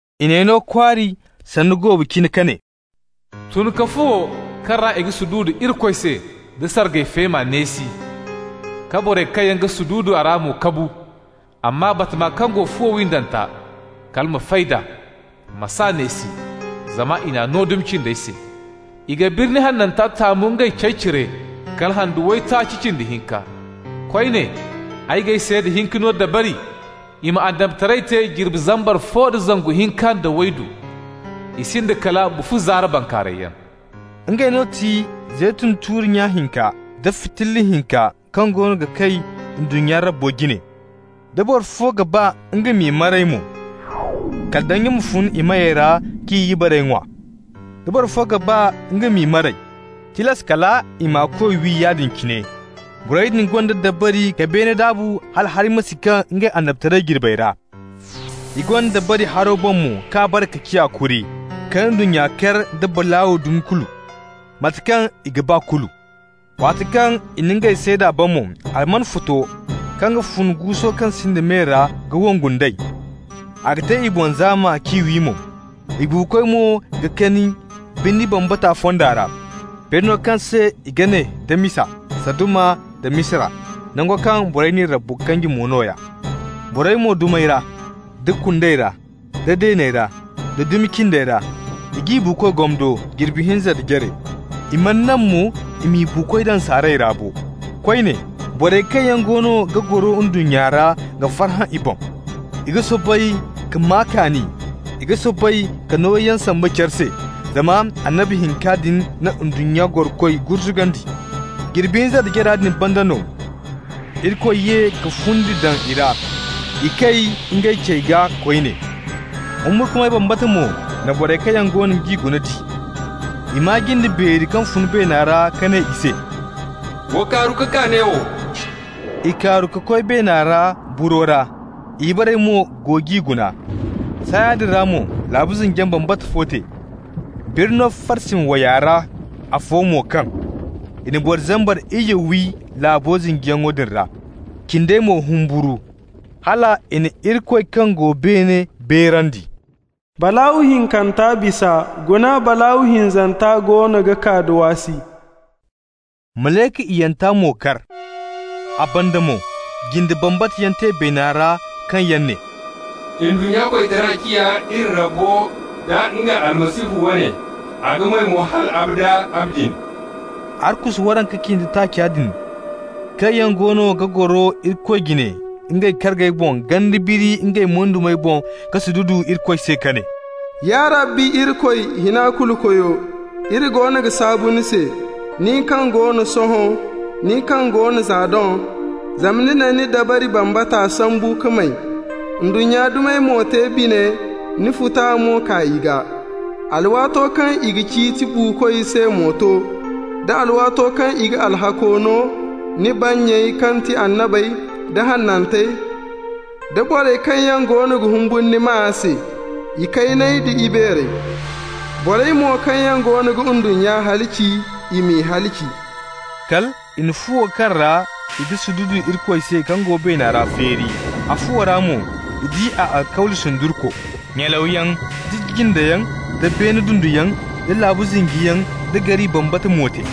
I n'ay no kwaari sanda goobu cine ka ne: «Tun ka fuwo kaŋ ra i ga sududu Irikoy se nda sargay feema neesi, ka borey kaŋ yaŋ ga sududu a ra mo kabu. Amma batama kaŋ go fuwo windanta, kala ma fay nd'a. Ma s'a neesi, zama i n'a no dumi cindey se. I ga birni hananta taamu ngey cey cire kala handu waytaaci cindi hinka. Koyne, ay g'ay seeda hinka no dabari i ma annabitaray te jirbi zambar fo da zangu hinka nda waydu. I sinda kala bufu zaara bankaarayyaŋ.» Ngey no ga ti zeytun tuuri nya hinka da fitilla hinka kaŋ goono ga kay ndunnya Rabbo jine. Da boro fo ga ba nga m'i maray mo, kala danji ma fun i meyey ra k'i ibarey ŋwa. Da boro fo ga ba nga m'i maray, tilas kal i m'a koy wi yaadin cine. Borey din gonda dabari ka beene daabu hala hari ma si kaŋ ngey annabitaray jirbey ra. I gonda dabari haro boŋ mo k'a bare ka ciya kuri, ka ndunnya kar da balaaw dumi kulu, mate kaŋ i ga ba kulu. Waati kaŋ i na ngey seeda ban mo, alman futo kaŋ ga fun guuso kaŋ sinda me ra ga wongu nd'ey. A ga te i boŋ zaama k'i wi mo. I buukoy mo ga kani birni bambata fonda ra, birno kaŋ se i ga ne da misa Saduma nda Misira, nango kaŋ borey n'i Rabbo kanji mo nooya. Borey mo dumey ra, da kundey ra, da deeney ra, da dumi cindey ra, i g'i buukoy gomdo jirbi hinza nda jare. I mana naŋ mo i m'i buukoy daŋ saaray ra bo. Koyne, borey kaŋ yaŋ goono ga goro ndunnya ra ga farhã i boŋ. I ga soobay ka maa kaani, i ga soobay ka nooyaŋ samba care se zama annabi hinka din na ndunnya gorokoy gurzugandi. Jirbi hinza nda jara din banda no, Irikoy ye ka fundi daŋ i ra, i kay ngey cey gaa koyne. Humburkumay bambata mo na borey kaŋ yaŋ goono g'i guna di. I maa jinde beeri kaŋ fun beena ra ka ne i se: «Wa kaaru ka kaa neewo!» I kaaru ka koy beena ra buro ra. I ibarey mo go g'i guna. Saaya din ra mo laabu zinjiyaŋ bambata fo te. Birno farsimi way ra afo mo kaŋ. I na boro zambar iyye wi laabo zinjiyaŋo din ra. Cindey mo humburu, hal i na Irikoy kaŋ go beene beerandi. Balaaw hinkanta bisa, guna balaaw hinzanta goono ga kaa da waasi. Malayka iyyanta mo kar. A banda mo jinde bambata yaŋ te beena ra kaŋ yaŋ ne: «Ndunnya koytara ciya iri Rabbo nda nga Almasihu wane, a ga may mo hal abada abadin.» Arkusu waranka cindi taaca din kaŋ yaŋ goono ga goro Irikoy jine ngey kargey boŋ ganda biri ngey moydumey boŋ ka sududu Irikoy se ka ne: «Ya Rabbi Irikoy, Hina-Kulu-Koyo, iri goono ga saabu ni se, nin kaŋ go no sohõ, nin kaŋ go no za doŋ, zama ni na ni dabari bambata sambu ka may. Ndunnya dumey mo te bine, ni futa mo kaa i gaa. Alwaato kaŋ i ga ciiti buukoy se mo to, da alwaato kaŋ i ga alhakko no ni bannyey kaŋ ti annabey, da hanantey da borey kaŋ yaŋ goono ga humburu ni maa se, ikayney nda ibeerey. Borey mo kaŋ yaŋ goono ga ndunnya halaci, i m'i halaci.» Kal i na fuwo kaŋ ra i ga sududu Irikoy se kaŋ go beena ra feeri. A fuwo ra mo i di a alkawli sundurko. Nyalawyaŋ, da jindeyaŋ, da beene dunduyaŋ, da laabu zinjiyaŋ da gari bambata mo te.